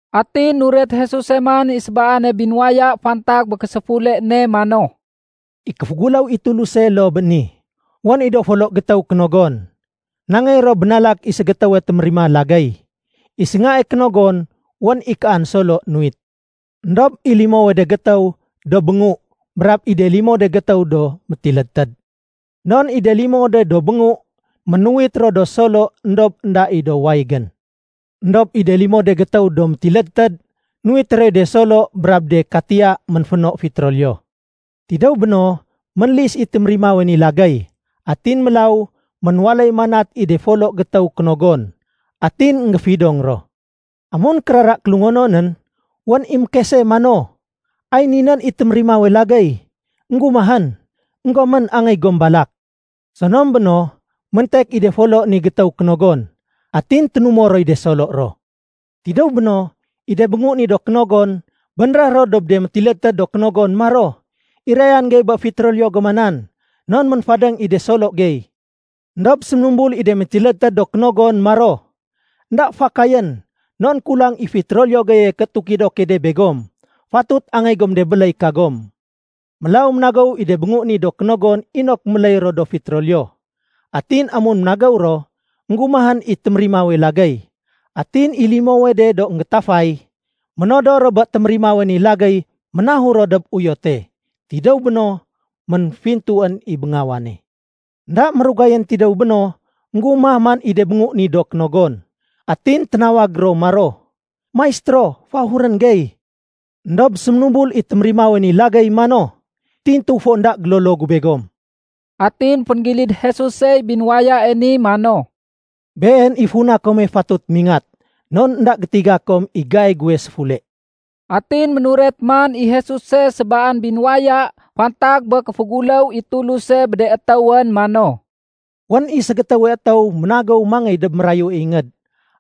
Atin nuret Jesuse man i sébaane binuwaya fantag bé késéfule ne mano, “I kéféguléw i Tuluse loo bé ni. Wén i do folo gétéw kénogon. Nangéy ro bénalak i ségétéwe témérima lagéy. I séngae kénogon wén i kaan solo nuwit. Endob i limowe de gétéw do béngu brab i de limo de gétéw do métilédtéd. Non i de limo de do béngu ménuwit ro do solo éndob énda i do wayégén. Endob i de limo de gétéw do métilédtéd nuwit roy de solo brab de katiya ménféno fitroliyo. Tidéw béno, ménlis i témérimawe ni lagéy. Atin mélaw ménwaléy manat i de ni folo gétéw kénogon. Atin énggéfidong ro. “Amun kérara kélungononén, wén i mékese mano, ‘Ay ni nén i témérimawe lagéy énggumahén! Enggomén, angéy gom balak.’ Sonom béno, méntek i de folo ni gétéw kénogon, atin ténumo roy de solo ro. Tidéw béno, i de béngu ni do kénogon bénréh ro dob de métilédtéd do kénogon maro, ‘Irayan gey bé fitroliyo goma nan, non ménfadéng i de solo gey.’ Endob séménumbul i de métilédtéd do kénogon maro, ‘Enda fakayén non kulang i fitroliyo geye ké tukido key de begom. Fatut angéy gom de béléy kagom.’ Mélaw ménagéw i de béngu ni do kénogon inok méléy ro do fitroliyo. Atin amun ménagéw ro, énggumahén i témérimawe lagéy. Atin i limowe de do énggétafay, ménodor ro bé témérimawe ni lagéy ménahur ro dob uyote. Tidéw béno, ménfintuén i béngawane. “Enda mérugayén tidéw béno, énggumah man i de béngu do kénogon. Atin téménawag ro maro, ‘Maistéro, féahurén gey.’ Endob séménumbul i témérimawe ni lagéy mano, ‘Tintu fo énda gélolo gu begom.’” Atin fénggilid Jesusey binuwayae ni mano, “Been i funa kome fatut mingat. Non énda gétiga kom i gai guwe séfule.” Atin ménuret man i Jesuse sébaan binuwaya fantag bé kéféguléw i Tuluse bé de étéwén mano, “Wén i ségétéwe étéw ménagéw mangéy dob mérayue ingéd.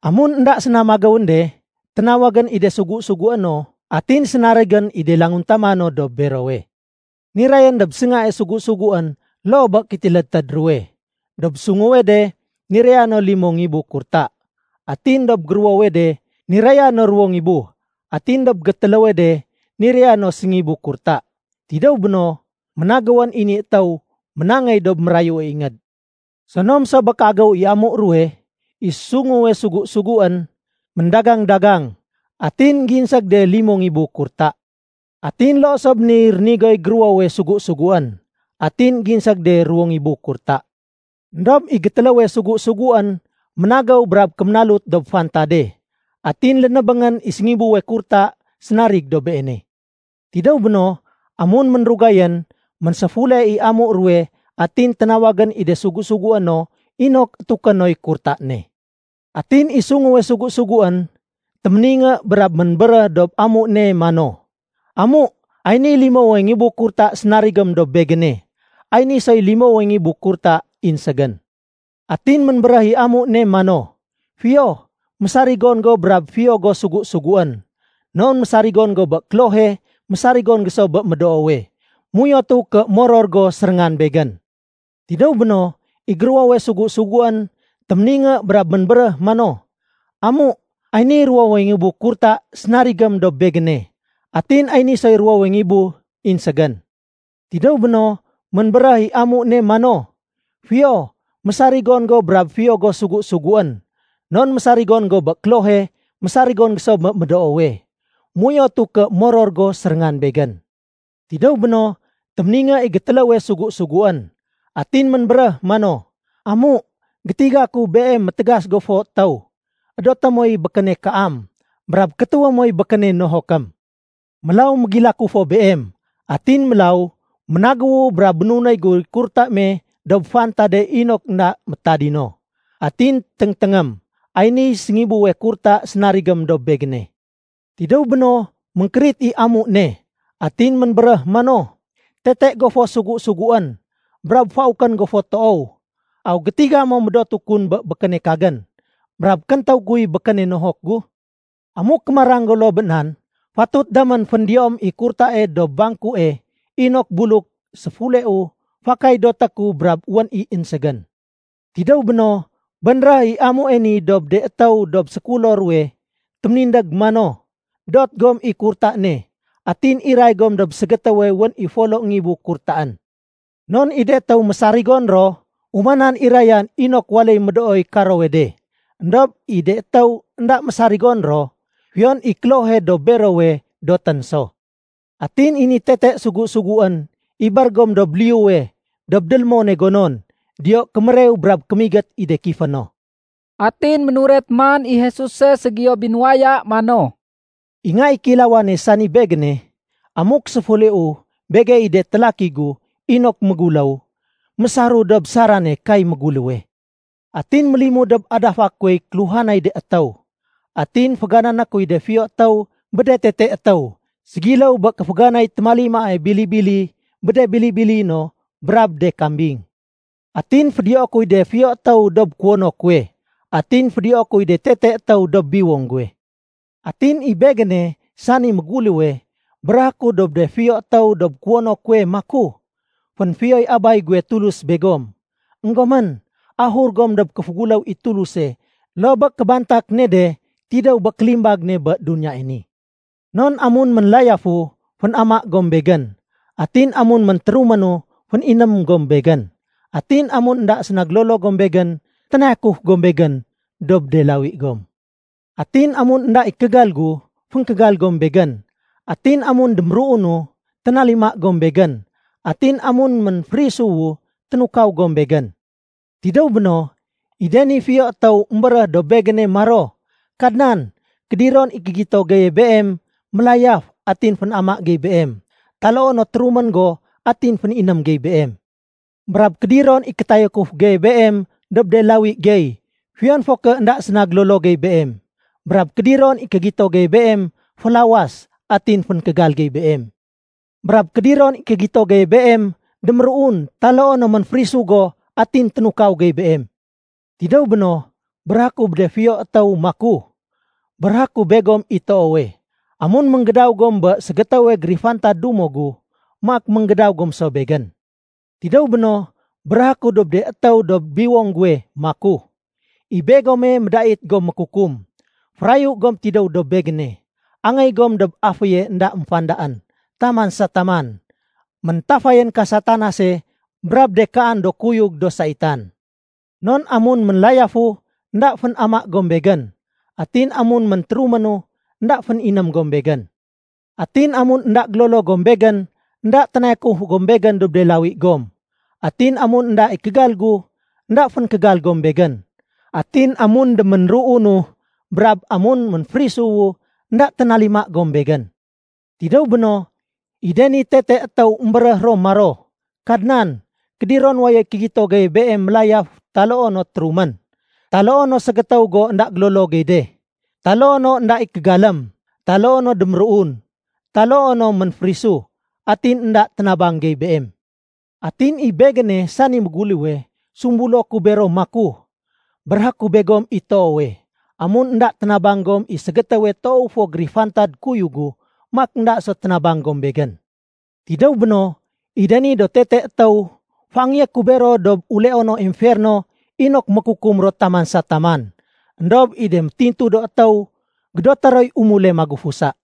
Amun énda séna magéwén de, ténawagén i de sugu-sugué no atin sénarigén i de languntama no dob berowe. Nirayén dob séngae sugu-suguén loo bé kétilédtéd ruwe. Dob sunguwe de niraya no limo ngibu kurta. Atin dob géruwowe de niraya no ruwo ngibu, atin dob gétéléwe de niraya no séngibu kurta. Tidéw béno, ménagéwén i ni étéw ménangéy dob mérayue ingéd. Sonom so bé kéagéw i amu ruwe, i sunguwe sugu-suguén méndagang-dagang. Atin énggéinség de limo ngibu kurta. Atin loo so bé niy rénigoy géruwowe sugu-suguén, atin énggéinség de ruwo ngibu kurta. Endob i gétéléwe sugu-suguén ménagéw brab kéménalut dob fantade, atin lénébéngén i séngibuwe kurta sénarig dob beene. “Tidéw béno, amun ménrugayén, ménséfule i amu ruwe atin ténawagén i de sugu-sugué no inok étuké noy kurta ne. Atin i sunguwe sugu-suguén, téméningé brab ménbéréh dob amu ne mano, ‘Amu, ay niy limowe ngibu kurta sénarigém dob begéne. Ay ni soy limowe ngibu kurta inségén.’ Atin ménbéréh i amu ne mano, ‘Fiyo, mésarigon go brab fiyo go sugu-suguén. Non mésarigon go bé klohe, mésarigon go so bé médoowe. Méuyotu ké moror go séréngan begén.’ Tidéw béno, i géruwowe sugu-suguén téméningé brab ménbéréh mano, ‘Amu, ay niy ruwowe ngibu kurta sénarigém dob begéne. Atin ay ni soy ruwowe ngibu inségén.’ Tidéw béno, ménbéréh i amu ne mano, ‘Fiyo, mésarigon go brab fiyo go sugu-suguén. Non mésarigon go bé klohe, mésarigon go so bé médoowe. Méuyotu ké moror go séréngan begén.’ Tidéw béno, téméningé i gétéléwe sugu-suguén. Atin ménbéréh mano, ‘Amu, gétiga ku beem métégas go fo étéw. Edoté moy békéne kaam, brab kétéwé moy békéne nohokém. Mélaw mégilaku fo beem. Atin mélaw, ménagéwu brab bénunéy guy kurta me dob fantade inok énda métadino. Atin téngténgém, ay niy séngibuwe kurta sénarigém dob begéne.’ Tidéw béno, ménkérit i amu ne, atin ménbéréh mano, ‘Tete go fo sugu-suguén brab faukén go fo toow. Aw gétiga mo médotu kun bé békéne kagén, brab kéntéw guy békéne nohok gu? Amuk kémarang go loo bé nan, fatut damén féndiyoém i kurtae dob bangkue inok buluk séfuleu, fakay doté ku brab wén i inségén.’ Tidéw béno, bénréh i amue ni dob de étéw dob sékulo ruwe téménindég mano, ‘Dot gom i kurta ne atin iray gom dob ségétéwe wén i folo ngibu kurtaén. Non i de étéw mésarigon ro, umanan irayan inok waléy médooy karowe de. Endob i de étéw énda mésarigon ro, fiyon i klohe dob berowe dotén so. Atin i ni tete sugu-suguén, ibér gom dob liyuwe dob délémone gonon. Diyo kémérew brab kémigét i de kifé no.’” Atin ménuret man i Jesuse ségiyo binuwaya mano, “I Nga i Kéilawane, sani Begéne, amuk séfuleu begey i de télaki gu inok méguléw, mésaru dob sarane kay méguléwe. Atin mélimud dob adafa kuwey kéluhanay de étéw. Atin féganané kuy de fiyo étéw bé de tete étéw ségiléw bé kéféganay témalimae bili-bili bé de bili-bili no brab de kambing. Atin fédiyoé kuy de fiyo étéw dob kuwono kuwe atin fédiyoé kuy de tete étéw dob biwong guwe. Atin i Begéne, sani méguléwe, béréhé ku dob de fiyo étéw dob kuwono kuwe maku, ‘Fénfiyoy Abay guwe Tulus begom. Enggomén, ahur gom dob kéféguléw i Tuluse loo bé kébantak ne de tidéw bé kélimbag ne bé duniyae ni. Non amun ménlayafu, fénama gom Begén. Atin amun méntéruménu, féniném gom Begén. Atin amun énda séna gélolo gom Begén, ténayakuf gom Begén dob de lawi gom. Atin amun énda i kégal gu, fénkégal gom Begén. Atin amun déménruunu, ténalima gom Begén. Atin amun ménférisuwu, ténukaw gom Begén.’ Tidéw béno, i de ni fiyo étéw émbéréh dob Begéne maro, ‘Kadnan, kédiron i kégito geye Beem mélayaf atin fénama gey Beem, taloo no térumén go atin féniném gey Beem? Brab kédiron i kétayakuf geye Beem dob de lawi gey fiyon fo ké énda séna gélolo gey Beem? Brab kédiron i kégito geye Beem félawas atin féngkégal gey Beem? Brab kédiron i kégito geye Beem déméruun taloo no ménférisu go atin ténukaw gey Beem?’ Tidéw béno, béréhé ku bé de fiyo étéw maku, ‘Béréhé ku begom i toowe, amun ménggédaw gom bé ségétéwe gérifantad dumo gu, maak ménggédaw gom so Begén.’ Tidéw béno, béréhé ku dob de étéw dob biwong guwe maku, ‘I begome médait gom mékukum, férayu gom tidéw dob Begéne. Angéy gom dob aféye énda émfandaén taman sa taman méntafayén ka Satanase brab de kaan do kuyug do saitan. Non amun ménlayafu, énda fénama gom Begén. Atin amun méntéruménu, énda féniném gom Begén. Atin amun énda gélolo gom Begén, énda ténayakuf gom Begén dob de lawi gom. Atin amun énda i kégal gu, énda fénkégal gom Begén. Atin amun déménruunu brab amun ménférisuwu, énda ténalima gom Begén.’ Tidéw béno, i de ni tete étéw émbéréh ro maro, ‘Kadnan, kédiron wayoy kégito geye Beem mélayaf taloo no térumén, taloo no ségétéw go énda gélolo gey de, taloo no énda i kégalém, taloo no déméruun, taloo no ménférisu, atin énda ténabang gey Beem?’ Atin i Begéne, sani méguléwe, sumbulo ku bero maku, ‘Béréhé ku begome i toowe, amun énda ténabang gom i ségétéwe toow fo gérifantad kuyug gu, maak énda so ténabang gom Begén.’ Tidéw béno, i de ni do tete étéw, féangéyé ku bero dob uleono emferno inok mékukum ro taman sa taman. Endob i de métintu do étéw gédoté roy umule magufusa.”